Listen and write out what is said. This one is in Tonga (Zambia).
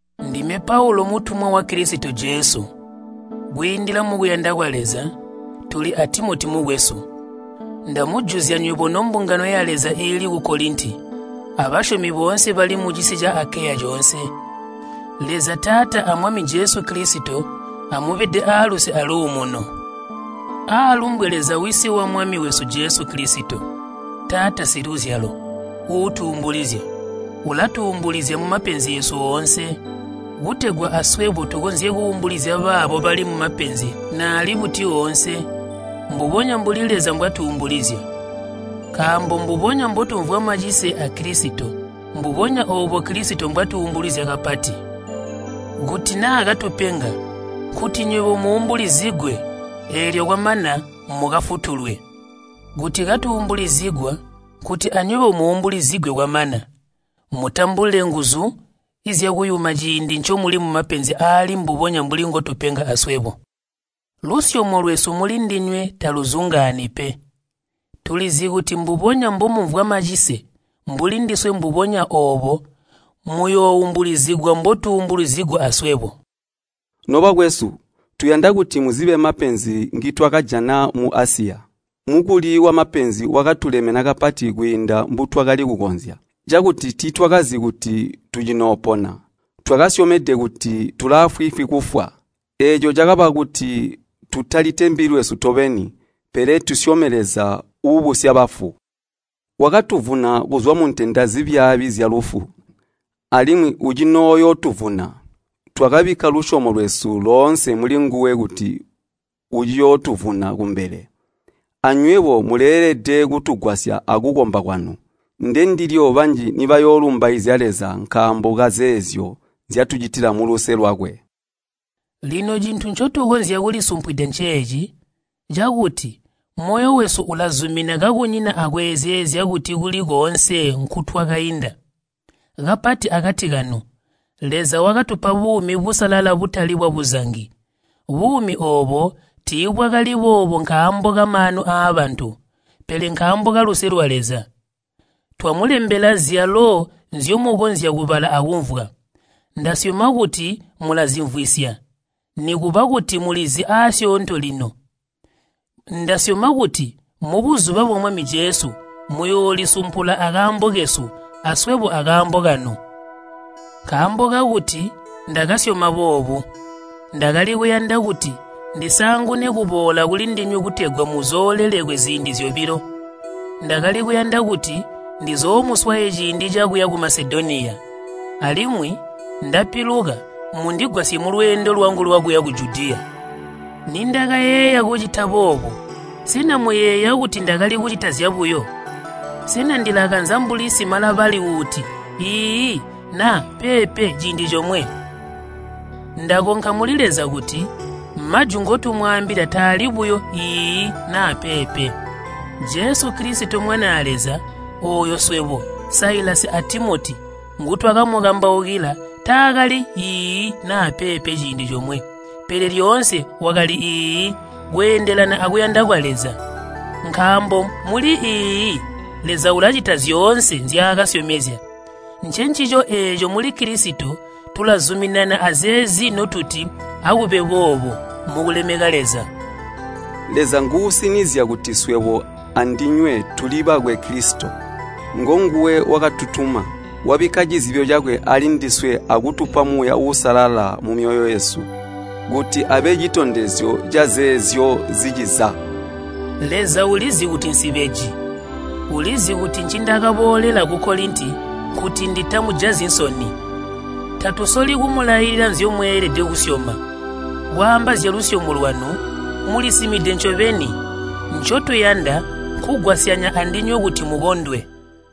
Ndime Paulu mutumwa wa Kilisito Jesu kwiindila mukuyanda kwa Leza, tuli a Timoti mukwesu. Ndamujuzya nywebo nombungano ya Leza iili ku Kolinti, abasyomi boonse bali mucisi ca Akeya coonse. Leza Taata a Mwami Jesu Kilisito amubede aaluse aluumuno. Aalumbwe Leza Wisi wa Mwami wesu Jesu Kilisito, Taata siluzyalo, uutuumbulizya. Ulatuumbulizya mumapenzi eesu oonse, kutegwa aswebo tukonzye kuumbulizya baabo bali mumapenzi naali buti oonse, mbubonya mbuli Leza mbwatuumbulizya. Nkaambo mbubonya mbotumvwa macise a Kilisito, mbubonya oobo Kilisito mbwatuumbulizya kapati. Kuti naa katupenga, nkuti nywebo muumbulizigwe eelyo kwamana mukafutulwe. Kuti katuumbulizigwa nkuti anywebo muumbulizigwe kwamana mutambule nguzu zyakuyuma ciindi ncomuli mumapenzi aali mbubonya mbuli ngotupenga aswebo. Lusyomo lwesu mulindinywe taluzungaani pe. Tulizi kuti mbubonya mbomumvwa macise mbuli ndiswe mbubonya oobo muyooumbulizigwa mbotuumbulizigwa aswebo. Nobakwesu, tuyanda kuti muzibe mapenzi ngitwakajana mu Asiya. Mukuli wamapenzi wakatulemena kapati kwiinda mbutwakali kukonzya, cakuti tiitwakazi kuti tucinoopona. Twakasyomede kuti tulaafwiifwi kufwa. Eeco cakaba kuti tutalitembi lwesu tobeni, pele tusyome Leza uubusya bafu. Wakatuvuna kuzwa muntenda zibyaabi zyalufu, alimwi ucinooyootuvuna. Twakabikka lusyomo lwesu loonse mulinguwe kuti uciyootuvuna kumbele. Anywebo muleelede kutugwasya akukomba kwanu. Ndendilyo banji nibayoolumbaizya Leza nkaambo kazeezyo nzyatucitila muluse lwakwe. Lino cintu ncotukonzya kulisumpwida nceeci, cakuti moyo wesu ulazumina kakunyina akweezeezya kuti kuli koonse nkutwakainda, kapati akati kanu, Leza wakatupa buumi busalala butali bwabuzangi. Buumi oobo tiibwakali boobo nkaambo kamaanu aabantu, pele nkaambo kaluse lwa Leza. Twamulembela zyalo nzyomukonzya kubala akumvwa. Ndasyoma kuti mulazimvwisya, nikuba kuti mulizi aasyoonto lino. Ndasyoma kuti mubuzuba bwa Mwami Jesu muyoolisumpula akaambo kesu, aswebo akaambo kanu. Nkaambo kakuti ndakasyoma boobu, ndakali kuyanda kuti ndisaangune kuboola kulindinywe kutegwa muzoolelekwe ziindi zyobilo. Ndakali kuyanda kuti ndizoomuswaye ciindi cakuya ku Masedoniya, alimwi ndapiluka mundigwasye mulweendo lwangu lwakuya ku Judiya. Nindakayeeya kucita boobo, sena muyeeya kuti ndakali kucita zyabuyo? Sena ndilakanza mbuli simalabali uuti “Iiyi” naa “Peepe” ciindi comwe? Ndakonka muli Leza kuti majwi ngotumwaambila taali buyo “Iiyi” naa “Peepe.” Jesu Kilisito Mwanaa Leza, ooyo swebo, Silivanusi a Timoti ngutwakamukambaukila taakali “Iiyi” naa “Pe” ciindi comwe, pele lyoonse wakali “Iiyi” kweendelana akuyanda kwa Leza. Nkaambo muli “Iiyi,” Leza ulacita zyoonse nzyaakasyomezya. Ncencico eeco muli Kilisito tulazuminana azeezi notuti “Akube boobo,” mukulemeka Leza. Leza nguusinizya kuti swebo andinywe tuli bakwe Kilisito. Ngonguwe wakatutuma, wabikka cizibyo cakwe aalindiswe akutupa Muuya Uusalala mumyoyo yesu kuti abe citondezyo cazeezyo ziciza. Leza ulizi kuti nsibeji. Ulizi kuti ncindakaboolela ku Kolinti nkuti nditamujazyi nsoni. Tatusoli kumulailila nzyomweelede kusyoma. Kwaamba zyalusyomo lwanu, mulisimide ncobeni. Ncotuyanda nkugwasyanya andinywe kuti mukondwe.